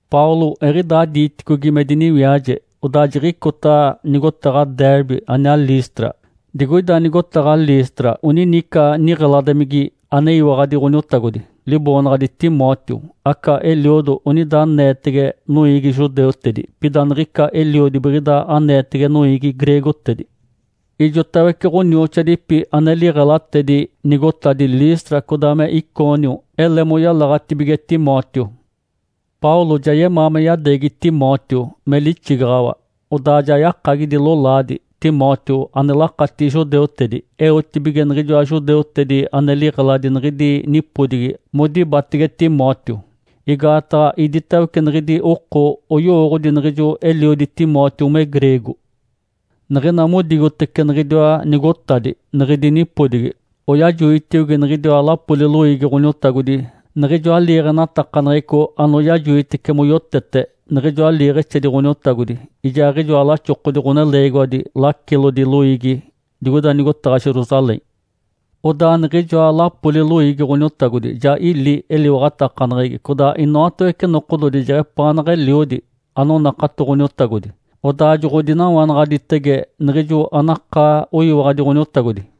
Paulo eɡ̶idaa diiticogi me diniwiaje, odaa jiɡ̶icota nigotaɡ̶a Derbe aniaa Listra. Digoida nigotaɡ̶a Listra onini ica niɡ̶eladimigi aneyiwaɡ̶adi Ǥoniotagodi, liboonaɡ̶adi Timóteo. Aca eliodo onida aneetege noiigi judeutedi, pida niɡ̶ica eliodi biɡ̶ida aneetege noiigi greegotedi. Ijotawece ɡ̶onioxoadipi ane liɡ̶elatedi nigotadi Listra codaa me Icônio ele moyalaɡ̶atibige Timóteo. Paulo ja yemaa me yadeegi Timóteo me lixigaɡ̶awa. Odaa ja yakagidi lolaadi Timóteo ane lakatigi judeutedi, eotibige niɡ̶ijoa judeutedi ane liɡ̶eladi niɡ̶idi nipodigi modibatege Timóteo, igaataɡ̶a iditawece niɡ̶idi oko oyowooɡ̶odi niɡ̶ijo eliodi Timóteo me greego. Niɡ̶ina modigotece niɡ̶idiwa nigotadi niɡ̶idi nipodigi, oyajigotiogi niɡ̶idiwa lapoli loiigi Ǥoniotagodi niɡ̶ijoa liiɡ̶enatakaneɡ̶eco anoyajoitece moyotete niɡ̶ijoa liiɡ̶exedi Ǥoniotagodi ijaaɡ̶ijoa laxokodi ɡ̶oneleegiwadi lacilodi loiigi digoida nigotaɡ̶a Jerusalém. Odaa niɡ̶ijoa lapoli loiigi Ǥoniotagodi ja ili eliwaɡ̶atakaneɡ̶egi codaa inoatawece nokododi jeɡ̶epaaneɡ̶eliodi anonakato Ǥoniotagodi, odaa joɡ̶odinawanaɡ̶aditege niɡ̶ijo anakaa oyiwaɡ̶adi Ǥoniotagodi.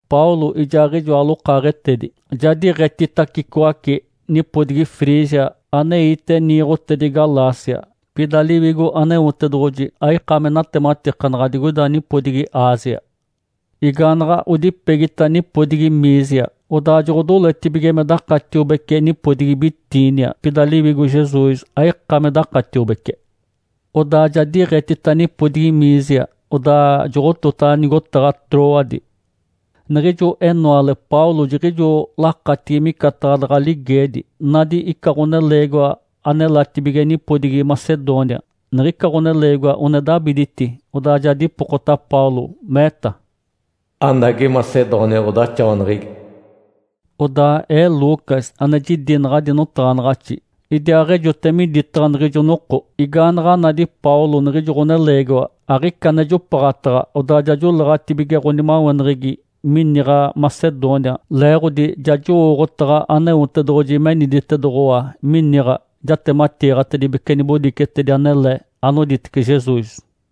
Paulo ijaaɡ̶ijoa lokaaɡ̶etedi ja diiɡ̶etitacicoace nipodigi Frígia aneite niiɡ̶otedi Galácia. Pida Liwigo Aneotedoɡ̶oji aika me natematikanaɡ̶a digoida nipodigi Ásia. Igaanaɡ̶a odipegita nipodigi Mísia, odaa joɡ̶odoletibige me dakatiobece nipodigi Bitínia, pida Liwigo Jesus aika me dakatiobece. Odaa ja diiɡ̶etita nipodigi Mísia, odaa joɡ̶otota nigotaɡ̶a Trôade. Niɡ̶ijo enoale Paulo jiɡ̶ijo lakatigi micataɡ̶a daɡ̶a ligeedi, nadi ica ɡ̶oneleegiwa anelatibige nipodigi Macedônia. Niɡ̶ica ɡ̶oneleegiwa one dabiditi, odaa ja dipokota Paulo, meeta, “Anagi Macedônia ɡ̶odaxawaneɡ̶egi.” (Odaa ee, Lucas ane jidi naɡ̶adi notaɡ̶anaɡ̶axi idiaaɡ̶ejote miditaɡ̶a niɡ̶ijo noko.) Igaanaɡ̶a nadi Paulo niɡ̶ijo ɡ̶oneleegiwa, aɡ̶ica ane jopaɡ̶ataɡ̶a, odaa ja joleeɡ̶atibige ɡ̶onimaweneɡ̶egi miniɡ̶a Macedônia, leeɡ̶odi ja jowooɡ̶otaɡ̶a Aneotedoɡ̶oji meniditedoɡ̶owa miniɡ̶a jatematiiɡ̶atedibece nibodicetedi anele anoditece Jesus.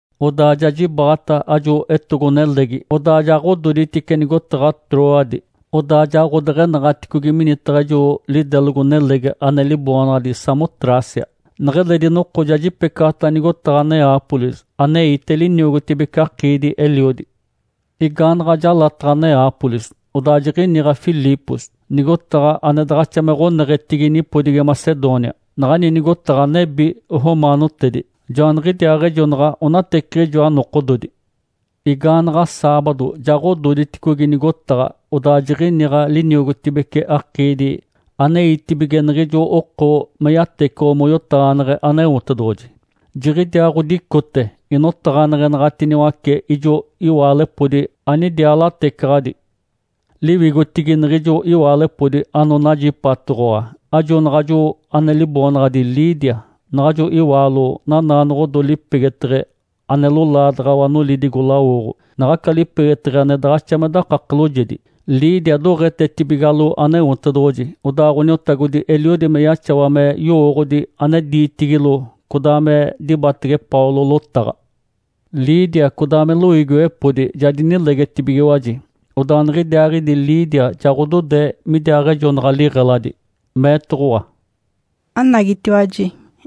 Odaa ja jibaɡ̶ata ajo etogo-nelegi, odaa ja ɡ̶ododitice nigotaɡ̶a Trôade, odaa ja ɡ̶odeɡ̶enaɡ̶aticogi minitaɡ̶a ijo lidelogo-nelegi ane liboonaɡ̶adi Samotrácia. Neɡ̶eledi noko ja jipecaɡ̶ata nigotaɡ̶a Neápolis aneite liniogotibece akiidi-eliodi. Igaanaɡ̶a jalataɡ̶a Neápolis, odaa jiɡ̶iniɡ̶a Filipos, nigotaɡ̶a ane daɡ̶axa me ɡ̶oneɡ̶etigi nipodigi Macedônia. Naɡ̶ani nigotaɡ̶a nebi romaanotedi. Joaniɡ̶idiaaɡ̶ejonaɡ̶a onateciɡ̶ijoa nokododi. Igaanaɡ̶a saabado ja ɡ̶ododiticogi nigotaɡ̶a, odaa jiɡ̶iniɡ̶a liniogotibece akiidi aneitibige niɡ̶ijo oko me yatecoɡ̶o moyotaɡ̶aneɡ̶e Aneotedoɡ̶oji. Jiɡ̶idiaa ɡ̶odicote inotaɡ̶aneɡ̶enaɡ̶atiniwace ijo iwaalepodi anidiaa latecaɡ̶adi. Liwigotigi niɡ̶ijo iwaalepodi anonajipatoɡ̶owa ajo naɡ̶ajo ane liboonaɡ̶adi Lídia. Naɡ̶ajo iwaalo nanaanoɡ̶odo lipegeteɡ̶e ane lolaadaɡ̶awa nolidigo-lawoɡ̶o, naɡ̶aca lipegeteɡ̶e ane daɡ̶axa me dakake loojedi. Lídia doɡ̶etetibigalo Aneotedoɡ̶oji, odaa Ǥoniotagodi eliodi me yaxawa me yowooɡ̶odi ane diitigilo codaa me dibatege Paulo lotaɡ̶a. Lídia codaa me loiigiwepodi ja dinilegetibigiwaji. Odaa niɡ̶idiaaɡ̶idi Lídia ja ɡ̶odode midiaaɡ̶ejonaɡ̶a liɡ̶eladi, meetoɡ̶owa, “Anagitiwaji,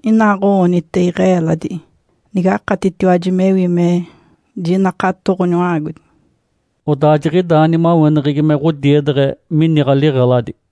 inaaɡ̶o-oonite iɡ̶e-eeladi nigakatitiwaji mewi me jinakato Ǥoniwa-aagodi.” Odaa jiɡ̶idaa nimaweneɡ̶egi me ɡ̶odiedeɡ̶e miniɡ̶a liɡ̶eladi.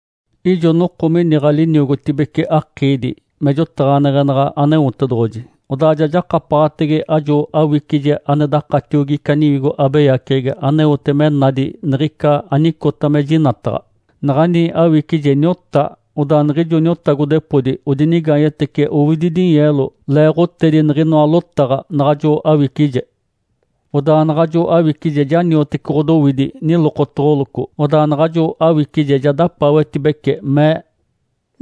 Ijo noko miniɡ̶a liniogotibece akiidi me jotaɡ̶aneɡ̶enaɡ̶a Aneotedoɡ̶oji, odaa ja jakapaɡ̶atege ajo awicije ane dakatiogi ica niwigo abeyaceɡ̶egi aneote me nadi niɡ̶ica anicota me jinataɡ̶a. Naɡ̶ani awicije niota, odaa niɡ̶ijo niotagodepodi odinigaanyetece owidi dinyeelo leeɡ̶otedi niɡ̶inoa lotaɡ̶a naɡ̶ajo awicije. Odaa naɡ̶ajo awicije ja niotece ɡ̶odowidi nilokotoɡ̶oloco, odaa naɡ̶ajo awicije ja dapaawetibece, mee,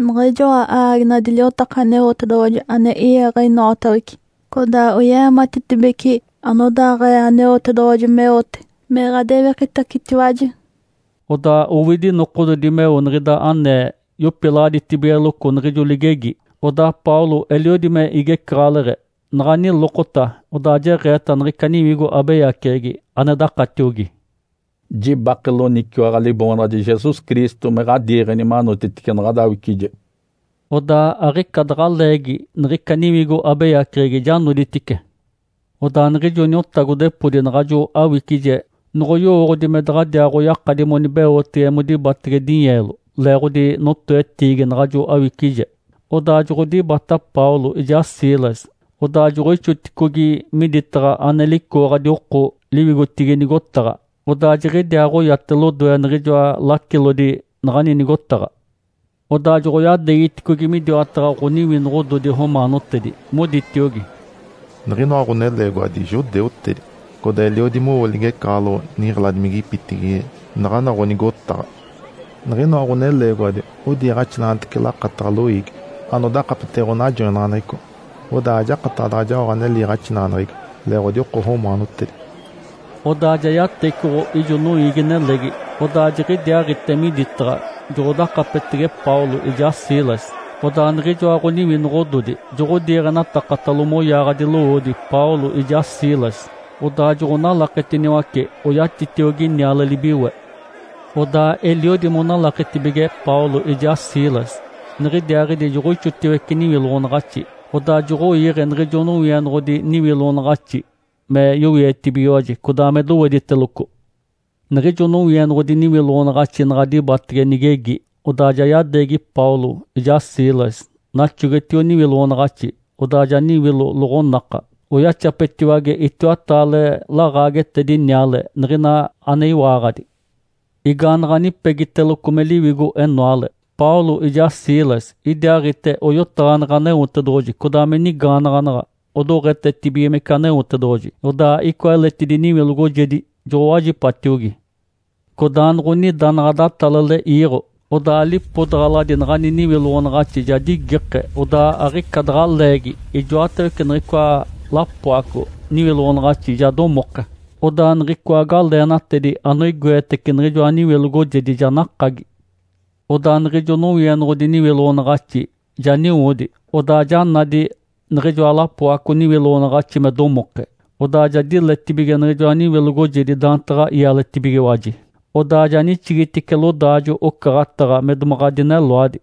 “Niɡ̶ijoa aaginadi liotaka Aneotedoɡ̶oji ane i-iiɡ̶e inoatawece, codaa oye-eematitibece anodaaɡ̶ee Aneotedoɡ̶oji meote me ɡ̶adewikitacetiwaji.” Odaa owidi nokododi meo niɡ̶ida anee yopilaɡ̶aditibigeloco niɡ̶ijo ligegi, odaa Paulo eliodi me igecaɡ̶aleɡ̶e, naɡ̶a nilokota, odaa jeɡ̶eeta niɡ̶ica niwigo abeyaceɡ̶egi ane dakatiogi, “Jibake loniciwaɡ̶a Liboonaɡ̶adi Jesus Cristo me ɡ̶adiiɡ̶eni manotitice naɡ̶ada awicije.” Odaa aɡ̶ica daɡ̶a leegi niɡ̶ica niwigo abeyaceɡ̶egi ja noditice. Odaa niɡ̶ijo niotagodepodi naɡ̶ajo awicije noɡ̶oyowooɡ̶odi me daɡ̶adiaaɡ̶oyakadi monibeotege modibatege dinyeelo leeɡ̶odi notoetiigi naɡ̶ajo awicije, odaa joɡ̶odibata Paulo ijaa Silas, odaa joɡ̶oixigiticogi miditaɡ̶a ane licooɡ̶adi oko liwigotigi nigotaɡ̶a, odaa jiɡ̶idiaaɡ̶oyate lodoe niɡ̶ijoa lacilodi naɡ̶ani nigotaɡ̶a. Odaa joɡ̶oyadeegiticogi midiwataɡ̶a ɡ̶oniwinoɡ̶ododi romaanotedi, moditiogi, “Niɡ̶inoa ɡ̶oneleegiwadi judeutedi, codaa eliodi mowo ligecaɡ̶aloɡ̶o niɡ̶eladimigipitigi naɡ̶ana ɡ̶onigotaɡ̶a. Niɡ̶inoa ɡ̶oneleegiwadi odiiɡ̶axinaɡ̶atece lakataɡ̶a loiigi anodakapetege ɡ̶onajoinaɡ̶aneɡ̶eco, odaa ajakataɡ̶a daɡ̶a jaoɡ̶a ane liiɡ̶axinaɡ̶aneɡ̶egi, leeɡ̶odi oko romaanotedi.” Odaa ja yatecoɡ̶o ijo noiigi-nelegi, odaa jiɡ̶idiaaɡ̶ite miditaɡ̶a joɡ̶odakapetege Paulo ijaa Silas. Odaa niɡ̶ijoa ɡ̶oniwinoɡ̶ododi joɡ̶odiiɡ̶enatakatalo moyaaɡ̶adi lowoodi Paulo ijaa Silas, odaa joɡ̶onalaketiniwace oyatitiogi niale-libiwe. Odaa eliodi monalaketibige Paulo ijaa Silas, niɡ̶idiaaɡ̶idi joɡ̶oixotiwece niwiloɡ̶onaɡ̶axi. Odaa joɡ̶oiiɡ̶e niɡ̶ijo nowienoɡ̶odi niwiloɡ̶onaɡ̶axi me yowietibigiwaji, codaa me dowediteloco. Niɡ̶ijo nowienoɡ̶odi niwiloɡ̶onaɡ̶axi naɡ̶a dibatege nigegi, odaa ja yadeegi Paulo ijaa Silas naxogetio niwiloɡ̶onaɡ̶axi, odaa ja niwilo loɡ̶onaka, oyaxapetiwage itiwataale laɡ̶aagetedi niale niɡ̶ina ane iwaaɡ̶adi. Igaanaɡ̶a nipegiteloco me liwigo-enoale, Paulo ijaa Silas idiaaɡ̶ite oyotaɡ̶aneɡ̶e Aneotedoɡ̶oji, codaa me nigaanaɡ̶anaɡ̶a, odoɡ̶etetibigimece Aneotedoɡ̶oji. Odaa icoa eletidi niwilogojedi joɡ̶owajipatiogi. Codaanoɡ̶onida naɡ̶a datalale iiɡ̶o, odaa lipodaɡ̶aladi naɡ̶ani niwiloɡ̶onaɡ̶axi ja digike. Odaa aɡ̶ica daɡ̶a leegi ijoatawece niɡ̶icoa lapoaco niwiloɡ̶onaɡ̶axi ja domoke. Odaa niɡ̶icoa galeenatedi anoigoetece niɡ̶ijoa niwilogojedi ja nakagi. Odaa niɡ̶ijo nowienoɡ̶odi niwiloɡ̶onaɡ̶axi ja niwodi, odaa ja nadi niɡ̶ijoa lapoaco niwiloɡ̶onaɡ̶axi me domoke. Odaa ja diletibige niɡ̶ijoa niwilogojedi daantaɡ̶a ialetibigiwaji, odaa ja nixigitice lodaajo-ocaɡ̶ataɡ̶a me domaɡ̶a dineloadi.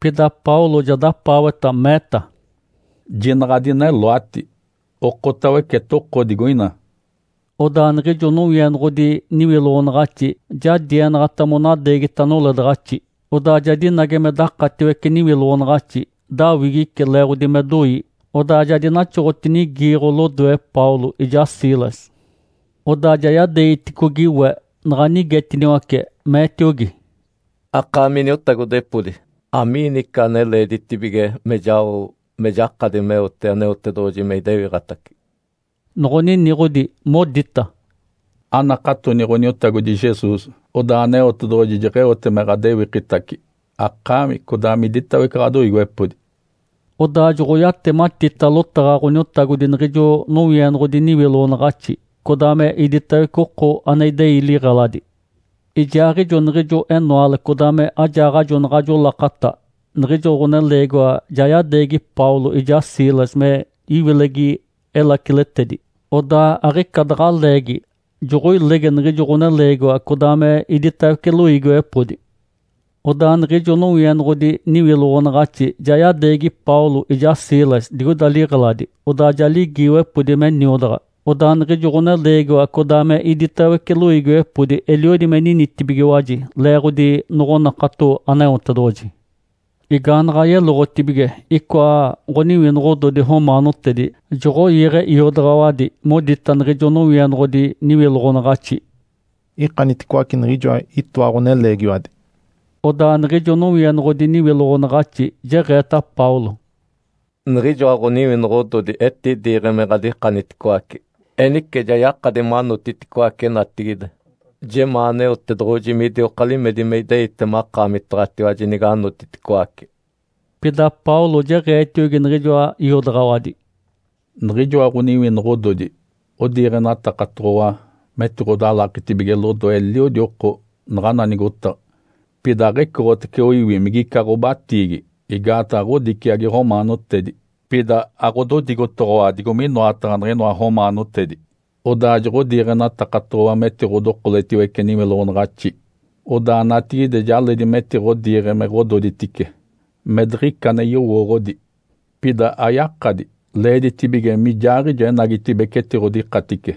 Pida Paulo ja dapaaweta, meeta, “Jinaɡ̶a adineloati, okotawece, etoko digoina!” Odaa niɡ̶ijo nowienoɡ̶odi niwiloɡ̶onaɡ̶axi ja dienaɡ̶ata monadeegita noledaɡ̶axi, odaa ja dinage me dakatiwece niwiloɡ̶onaɡ̶axi. Dawigice leeɡ̶odi me doi, odaa ja dinaxoɡ̶otinigiiɡ̶o lodoe Paulo ijaa Silas. Odaa ja yadeegiticogi we, naɡ̶a nigetiniwace, meetiogi, “Akaami iniotagodepodi, amiini ica ane leeditibige me jao me jakadi meote Aneotedoɡ̶oji me idewiɡ̶atace?” Noɡ̶oniniɡ̶odi, modita, “Anakatoni Ǥoniotagodi Jesus, odaa Aneotedoɡ̶oji jeɡ̶eote me ɡ̶adewikitace akaami codaa miditawece ɡ̶adoiigiwepodi.” Odaa joɡ̶oyatematita lotaɡ̶a Ǥoniotagodi niɡ̶ijo nowienoɡ̶odi niwiloɡ̶onaɡ̶axi, codaa me iditawece oko ane idei liɡ̶eladi. Ijaaɡ̶ijo niɡ̶ijo enoale codaa me ajaaɡ̶ajo naɡ̶ajo lakata niɡ̶ijo ɡ̶oneleegiwa ja yadeegi Paulo ijaa Silas me iwilegi elaciletedi. Odaa aɡ̶ica daɡ̶a leegi joɡ̶oilege niɡ̶ijo ɡ̶oneleegiwa codaa me iditawece loiigiwepodi. Odaa niɡ̶ijo nowienoɡ̶odi niwiloɡ̶onaɡ̶axi ja yadeegi Paulo ijaa Silas digoida liɡ̶eladi, odaa ja ligiiwepodi me niodaɡ̶a. Odaa niɡ̶ijo ɡ̶oneleegiwa codaa me iditawece loiigiwepodi eliodi me ninitibigiwaji leeɡ̶odi noɡ̶onakato Aneotedoɡ̶oji. Igaanaɡ̶a yeloɡ̶otibige, icoa ɡ̶oniwinoɡ̶ododi romaanotedi joɡ̶oiiɡ̶e iodaɡ̶awadi modita niɡ̶ijo nowienoɡ̶odi niwiloɡ̶onaɡ̶axi, “Ikaniticoace niɡ̶ijoa itoa ɡ̶oneleegiwadi.” Odaa niɡ̶ijo nowienoɡ̶odi niwiloɡ̶onaɡ̶axi jeɡ̶eeta Paulo, “Niɡ̶ijoa ɡ̶oniwinoɡ̶ododi etidiiɡ̶e me ɡ̶adikaniticoace. Enice ja yakadi manotiticoace natigide. Jemaa Aneotedoɡ̶oji midioka limedi me ideite makaamitaɡ̶atiwaji niganotiticoace!” Pida Paulo jeɡ̶eetiogi niɡ̶ijoa iodaɡ̶awadi, “Niɡ̶ijoa ɡ̶oniwinoɡ̶ododi odiiɡ̶enatakatoɡ̶owa metiɡ̶odalaketibige lodoe eliodi oko naɡ̶ana nigotaɡ̶a, pida aɡ̶ecoɡ̶otace oiwi migica ɡ̶obatiigi, igaataɡ̶a ɡ̶odiciagi romaanotedi. Pida aɡ̶ododigotoɡ̶owa digo minoataɡ̶a niɡ̶inoa romaanotedi. Odaa joɡ̶odiiɡ̶enatakatoɡ̶owa metiɡ̶odokoletiwece niwiloɡ̶onaɡ̶axi. Odaa natigide ja leedi metiɡ̶odiiɡ̶e me ɡ̶ododitice, me diɡ̶ica ane yowooɡ̶odi. Pida ayakadi! Leeditibige mijaaɡ̶ijo enagitibeci etiɡ̶odikatice.”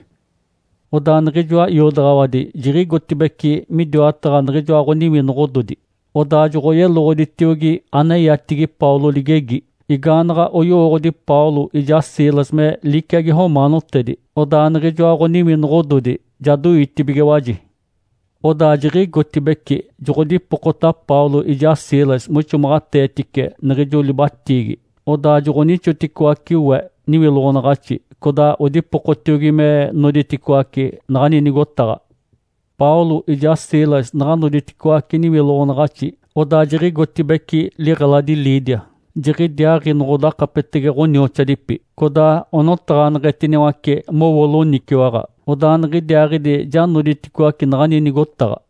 Odaa niɡ̶ijoa iodaɡ̶awadi jiɡ̶igotibeci midiwataɡ̶a niɡ̶ijoa ɡ̶oniwinoɡ̶ododi, odaa joɡ̶oyeloɡ̶oditiogi aneyatigi Paulo ligegi. Igaanoɡ̶oyowooɡ̶odi Paulo ijaa Silas me liciagi romaanotedi, odaa niɡ̶ijoa ɡ̶oniwinoɡ̶ododi ja doitibigiwaji. Odaa jiɡ̶igotibeci joɡ̶odipokota Paulo ijaa Silas moixomaɡ̶ateetice niɡ̶ijo libatiigi. Odaa joɡ̶onixoticoace we niwiloɡ̶onaɡ̶axi, codaa odipokotiogi me noditicoaci naɡ̶ani nigotaɡ̶a. Paulo ijaa Silas naɡ̶a noditicoaci niwiloɡ̶onaɡ̶axi, odaa jiɡ̶igotibeci liɡ̶eladi Lídia. Jiɡ̶idiaaɡ̶i noɡ̶odakapetege ɡ̶onioxoadipi, codaa onotaɡ̶aneɡ̶etiniwace mowo loniciwaɡ̶a, odaa niɡ̶idiaaɡ̶idi ja noditicoaci naɡ̶ani nigotaɡ̶a.